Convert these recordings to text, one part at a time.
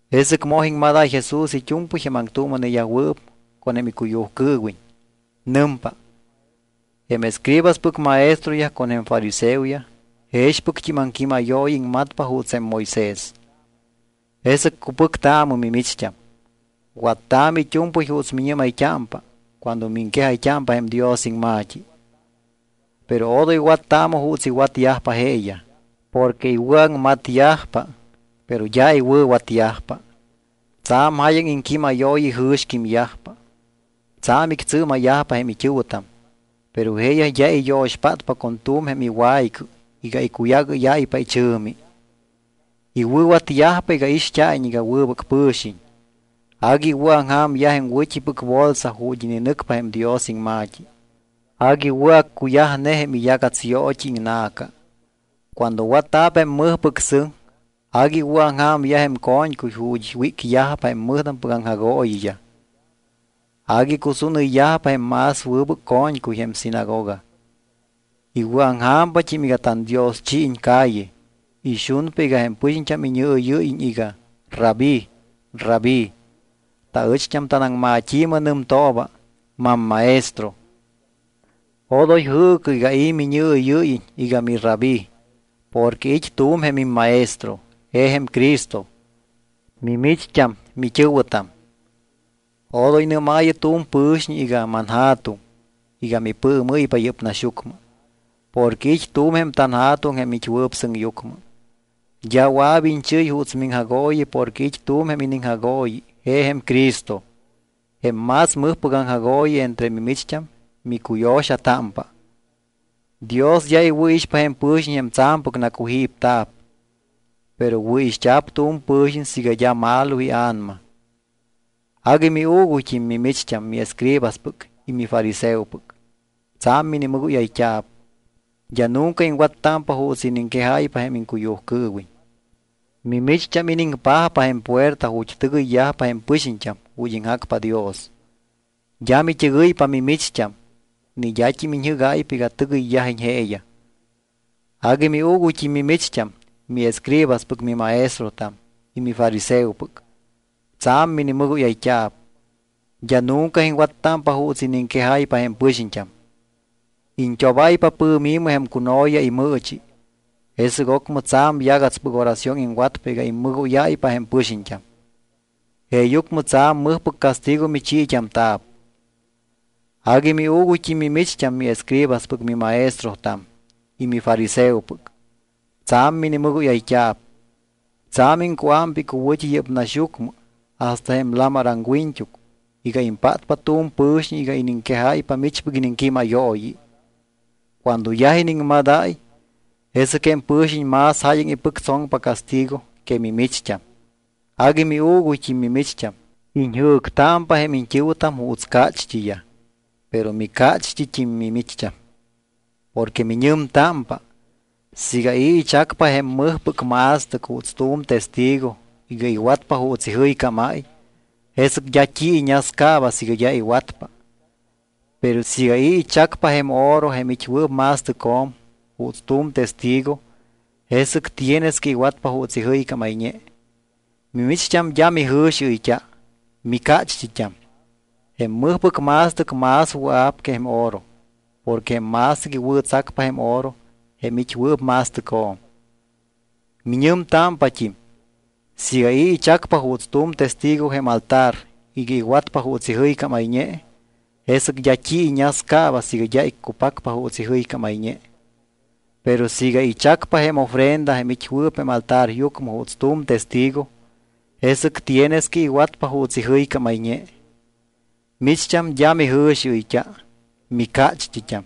Jesɨc moj iŋmadáy Jesús it́u̱mpɨy jém aŋtuuma̱neyajwɨɨp con jém icuyujcɨɨwiñ. Nɨmpa: —Jém escribaspɨc maestroyaj con jém fariseoyaj jexpɨct́im aŋquímayooyi iŋmatpa juuts jém Moisés. Jesɨc cupɨctaamɨ mimicht́am, wattaamɨ it́u̱mpɨy juuts miñɨ́mayt́ámpa cuando miŋquejayt́ámpa jém Dios iŋma̱t́i. Pero odoy wattaamɨ juuts iwatyajpa jeeyaj. Porque iwɨ̱aŋmatyajpa, pero d́a iwɨ̱watyajpa. Tsa̱m jáyaŋ iŋquímayooyi ijɨ̱xquímyajpa, tsa̱m ictsɨɨma̱yajpa jém it́ɨ̱wɨtam, pero jeeyaj d́a iyo̱xpátpa con tu̱m jém iwaycɨ iga icuyagɨ́yáypa ichɨ̱mi. Iwɨ̱watyajpa iga ixt́a̱iñ iga wɨbɨc pɨ̱xiñ. Agui iwɨ̱aŋja̱myaj jém wɨ̱t́ipɨc bolsa ju̱t́ ininɨcpa jém Dios iŋma̱t́i. Agui wɨ̱ accuyajne jém iyagats yoot́i iŋna̱ca. Cuando watta̱p jém mɨjpɨc sɨŋ, agui iwɨ̱aŋja̱myaj jém co̱ñcuy ju̱t́ wícyajpa jém mɨjtampɨc aŋjagooyiyaj. Agui icusúnɨyyajpa jém más wɨbɨc co̱ñcuy jém sinagoga. Iwɨ̱aŋja̱mpat́im iga tandioschiiñ calle. Ixunpa iga jém pɨxiñt́am iñɨɨyɨ́yiñ iga: “Rabí, Rabí”. Taɨcht́am tanaŋmat́i̱mɨ nɨmtooba: “Mammaestro”. ’Odoy jɨɨcɨ iga i̱ miñɨɨyɨ́yiñ iga miRabí, porque it́ tu̱m jém imMaestro, je jém Cristo. Mimicht́am mit́ɨ̱wɨtam. Odoy nɨ́maayɨ tu̱m pɨ̱xiñ iga “Manja̱tuŋ” iga mipɨɨmɨ́ypa yɨ́p naxyucmɨ, porque it́ tu̱m jém tanJa̱tuŋ jém it́wɨɨp sɨŋyucmɨ. D́a wɨa̱p iñchɨ́y juuts miŋjagooyi porque it́ tu̱m jém iniŋjagooyi je jém Cristo. Jém más mɨjpɨc aŋjagooyi entre mimicht́am micuyo̱xatámpa. Dios d́a iwɨ̱ixpa jém pɨ̱xiñ jém tsa̱mpɨc nacujípta̱p. Pero wɨ̱ixt́a̱p tu̱m pɨ̱xiñ siiga d́a malo ia̱nama. ’Agui miuuguyt́im, mimicht́am, miescribaspɨc y mifariseopɨc. Tsa̱m minimɨgóyayt́a̱p. D́a nunca iŋwattámpa juuts iniŋquejáypa jém iŋcuyujcɨɨwiñ. Mimicht́am iniŋpajpa jém puerta ju̱t́ tɨgɨyyajpa jém pɨxiñt́am ju̱t́ iŋjacpa Dios. D́a mit́ɨgɨypa mimicht́am, ni d́at́im iñj ɨ́gáypa iga tɨgɨyyajiñ jeeyaj. ’Agui miuuguyt́im mimicht́am, miescribaspɨc mimaestrotam y mifariseopɨc. Tsa̱m minimɨgóyayt́a̱p. D́a nunca iŋwattámpa juuts iniŋquejáypa jém pɨxiñt́am. Iñt́obáypa pɨ̱mi̱mɨ jém cuno̱ya imɨɨchi, jesɨc ocmɨ tsa̱m yagatspɨc oración iŋwatpa iga immɨgóyáypa jém pɨxiñt́am. Jeeyucmɨ tsa̱m mɨjpɨc castigo michiit́amta̱p. ’Agui miuuguyt́im, mimicht́am, miescribaspɨc mimaestrotam y mifariseopɨc. Tsa̱m minimɨgóyayt́a̱p. Tsa̱m iŋcuámpa icuwɨ̱t́i yɨ́p naxyucmɨ hasta jém lamar aŋwiñt́uc iga impátpa tu̱m pɨ̱xiñ iga iniŋquejáypa michpɨc iniŋquímayooyi. Cuando yaj iniŋmadáy, jesɨc jém pɨ̱xiñ más jáyaŋ ipɨctsoŋpa castigo que mimicht́am. ’Agui miuuguyt́im, mimicht́am, iñjɨ̱ctámpa jém iñt́ɨ̱wɨtam juuts cácht́iyaj, pero micácht́it́im mimicht́am. Porque miñɨmtámpa, siiga i̱ ichacpa jém mɨjpɨc ma̱stɨc juuts tu̱m testigo iga iwatpa juuts ijɨycámáy, jesɨc d́a t́i iñascaaba siiga d́a iwatpa. Pero siiga i̱ ichacpa jém oro jém it́wɨɨp ma̱stɨcjo̱m juuts tu̱m testigo, jesɨc tienes que iwatpa juuts ijɨycámayñe. Mimicht́am d́a mijɨ̱xiɨyt́a. Micácht́it́am. Jém mɨjpɨc ma̱stɨc más wɨa̱p que jém oro porque jém ma̱stɨc iwɨ̱tsacpa jém oro jém it́wɨɨp ma̱stɨcjo̱m. ’Miñɨmtámpat́im: “Siiga i̱ ichacpa juuts tu̱m testigo jém altar iga iwatpa juuts ijɨycámayñe, jesɨc d́a t́i iñascaaba siiga d́a iccupacpa juuts ijɨycámayñe. Pero siiga ichacpa jém ofrenda jém it́wɨɨp jém altaryucmɨ juuts tu̱m testigo, jesɨc tienes que iwatpa juuts ijɨycámayñe.” Micht́am d́a mijɨ̱xiɨyt́a. Micácht́it́am.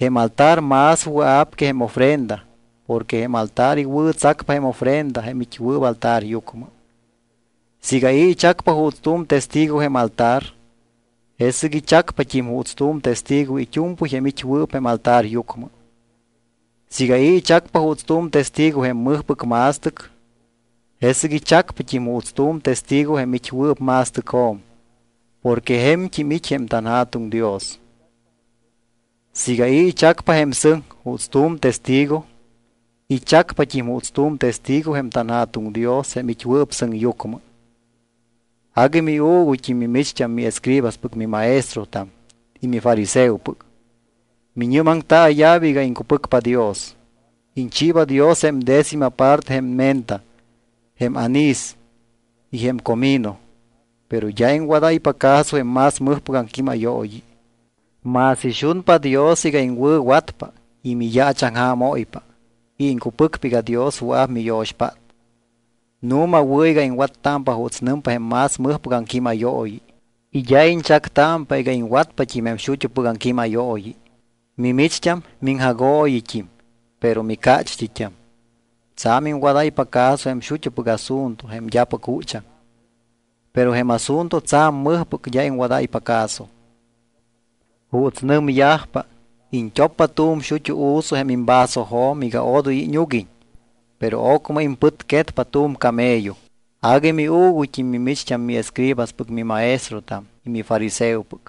Jém altar más wɨa̱p que jém ofrenda porque jém altar iwɨ̱tsacpa jém ofrenda jém it́wɨɨp altaryucmɨ. Siiga i̱ ichacpa juuts tu̱m testigo jém altar, jesɨc ichacpat́im juuts tu̱m testigo it́u̱mpɨy jém it́wɨɨp jém altaryucmɨ. Siiga i̱ ichacpa juuts tu̱m testigo jém mɨjpɨc ma̱stɨc, jesɨc ichacpat́im juuts tu̱m testigo jém it́wɨɨp ma̱stɨcjo̱m porque je̱mt́im it́ jém tanJa̱tuŋ Dios. Siiga i̱ ichacpa jém sɨŋ juuts tu̱m testigo, ichacpat́im juuts tu̱m testigo jém tanJa̱tuŋ Dios jém it́wɨɨp sɨŋyucmɨ. ’Agui miuuguyt́im, mimicht́am, miescribaspɨc mimaestrotam y mifariseopɨc. Miñɨ́maŋtaaya̱p iga iŋcupɨcpa Dios. Iñchiiba Dios jém décima parte jém menta, jém anís y jém comino, pero d́a iŋwadáypa caso jém más mɨjpɨc aŋquímayooyi. Más ixunpa Dios iga iŋwɨ̱watpa y miyaachaŋjaamóypa y iŋcupɨcpa iga Dios wɨa̱p miyo̱xpát. Nu̱ma wɨ̱ iga iŋwattámpa juuts nɨmpa jém más mɨjpɨc aŋquímayooyi y d́a iñchactámpa iga iŋwatpat́im jém xut́upɨc aŋquímayooyi. ’Mimicht́am miŋjagooyit́im, pero micácht́it́am. Tsa̱m iŋwadáypa caso jém xut́upɨc asunto jém d́apɨc juchaŋ. Pero jém asunto tsa̱m mɨjpɨc d́a iŋwadáypa caso. Juuts nɨmyajpa, iñt́oppa tu̱m xut́u u̱su jém imvasojo̱m iga odoy íñuguiñ, pero ocmɨ impɨtquetpa tu̱m camello. ’Agui miuuguyt́im, mimicht́am, miescribaspɨc mimaestrotam y mifariseopɨc,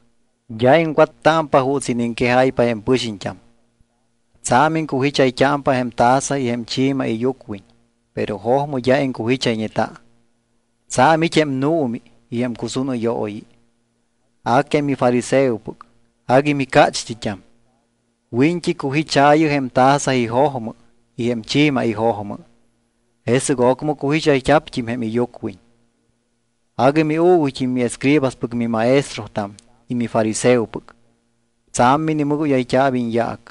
d́a iŋwattámpa juuts iniŋquejáypa jém pɨxiñt́am. Tsa̱m iŋcujichayt́ámpa jém taza y jém chi̱ma iyucwiñ, pero jojmɨ d́a iŋcujichayñeta, tsa̱m it́ jém nuumi y jém cusúnɨyooyi. A que mifariseopɨc, agui micácht́it́am. Wiñt́i cujichaayɨ jém taza ijojmɨ y jém chi̱ma ijojmɨ, jesɨc ocmɨ cujichayt́a̱pt́im jém iyucwiñ. ’Agui miuuguyt́im miescribaspɨc mimaestrotam y mifariseopɨc, tsa̱m minimɨgóyayt́a̱p iñyaac.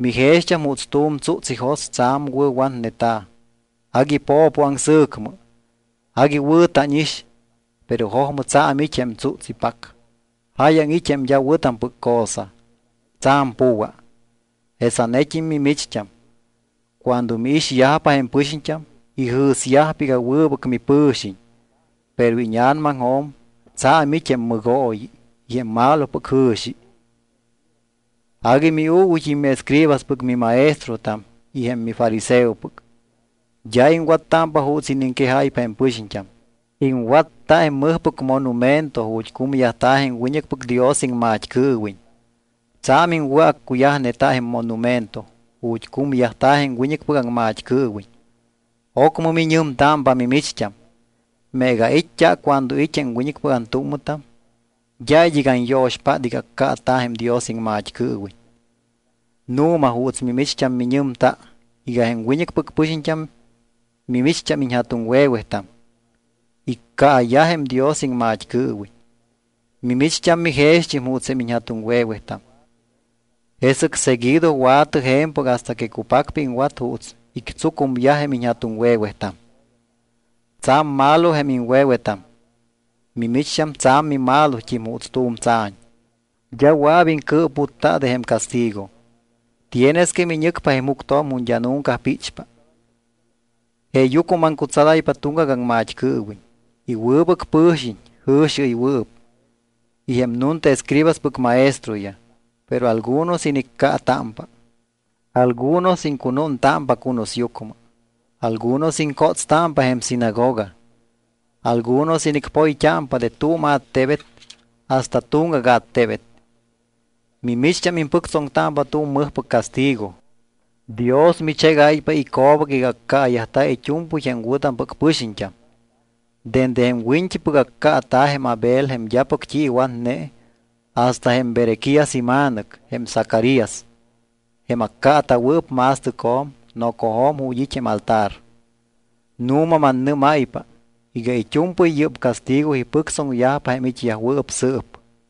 Mijext́am juuts tu̱m tsúts ijos tsa̱m wɨ̱watneta̱, agui po̱po aŋsɨ̱cmɨ. Agui wɨ̱ tánix. Pero jojmɨ tsa̱m it́ jém tsúts ipac. Jáyaŋ it́ jém d́a wɨ̱tampɨc cosa, tsa̱m pu̱wa. Jesanet́im mimicht́am, cuando miixyajpa jém pɨxiñt́am, ijɨ̱syajpa iga wɨbɨc mipɨ̱xiñ, pero íña̱namaŋjo̱m tsa̱m it́ jém mɨgooyi y jém malopɨc jɨ̱xi. ’Agui miuuguyt́im miescribaspɨc mimaestrotam y jém mifariseopɨc, d́a iŋwattámpa juuts iniŋquejáypa jém pɨxiñt́am. Iŋwatta jém mɨjpɨc monumento ju̱t́ cumyajta̱ jém wiñɨcpɨc Dios iŋmat́cɨɨwiñ. Tsa̱m iŋwɨ̱accuyajneta jém monumento ju̱t́ cumyajta̱ jém wiñɨcpɨc aŋmat́cɨɨwiñ. Ocmɨ miñɨmtámpa mimicht́am: “Meega ait́t́a cuando it́ jém wiñɨcpɨc antúmmɨtam, d́a id́ɨc anyo̱xpát iga accaata̱ jém Dios iŋmat́cɨɨwiñ.” Nu̱ma juuts mimicht́am miñɨmta iga jém wiñɨcpɨc pɨxiñt́am mimicht́am iñja̱tuŋwe̱wetam. Iccaayaj jém Dios iŋmat́cɨɨwiñ. Mimicht́am mijext́im juuts jém iñja̱tuŋwe̱wetam. Jesɨc seguido wa̱tɨ je̱mpɨc hasta que cupacpa iŋwat juuts ictsucumyaj jém iñja̱tuŋwe̱wetam. ’Tsa̱m malo jém iŋwe̱wetam. Mimicht́am tsa̱m mimalot́im juuts tu̱m tsa̱ñ. D́a wɨa̱p iŋcɨɨputta de jém castigo. Tienes que miñɨcpa jém juctjo̱m ju̱t́ d́a nunca píchpa. Jeeyucmɨ maŋcutsadáypa tuŋgac aŋmat́cɨɨwiñ, y wɨbɨc pɨxiñt́am jɨ̱xiɨywɨɨp, y jém nunta escribaspɨc maestroyaj. Pero algunos iniccaatámpa. Algunos iŋcunúntámpa cunusyucmɨ. Algunos iŋcótstámpa jém sinagoga. Algunos inicpoyt́ámpa de tu̱m attebet hasta tuŋgac attebet. Micht́am impɨctsoŋtámpa tu̱m mɨjpɨc castigo. Dios michégáypa ico̱bac iga accaayajta̱ it́u̱mpɨy jém wɨ̱tampɨc pɨxiñt́am, dende jém wiñt́ipɨc accaata̱ jém Abel jém d́apɨc t́i iwatne, hasta jém Berequías ima̱nɨc, jém Zacarías, jém accaata̱wɨɨp ma̱stɨcjo̱m nocojo̱m ju̱t́ it́ jém altar. Nu̱ma mannɨ́máypa iga it́u̱mpɨy yɨ́p castigo ipɨctsoŋyajpa jém it́yajwɨɨp sɨɨp.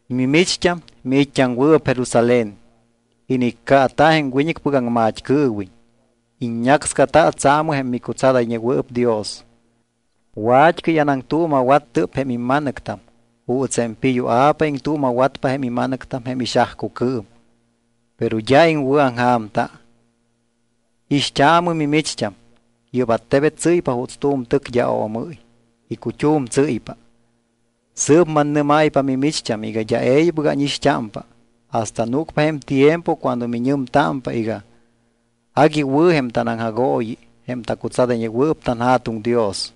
’Mimicht́am, miit́t́aŋwɨɨp Jerusalén, iniccaata jém wiñɨcpɨc aŋmat́cɨɨwiñ. Iññácscata tsaamɨ jém micutsadayñewɨɨp Dios. Wat́cɨy anaŋtuuma̱wattɨp jém imma̱nɨctam juuts jém piyua̱pa iŋtuuma̱watpa jém ima̱nɨctam jém ixajcucɨɨm, pero d́a iŋwɨ̱aŋja̱mta. Ixt́aamɨ mimicht́am, yɨ́p attebet tsɨ́ypa juuts tu̱m tɨc d́a oomɨ́y. Icut́um tsɨ́ypa. Sɨɨp mannɨ́máypa mimicht́am iga d́a e̱ybɨc ánixt́ámpa hasta núcpa jém tiempo cuando miñɨmtámpa iga: “Agui wɨ̱ jém tanaŋjagooyi jém tacutsadayñewɨɨp tanJa̱tuŋ Dios.”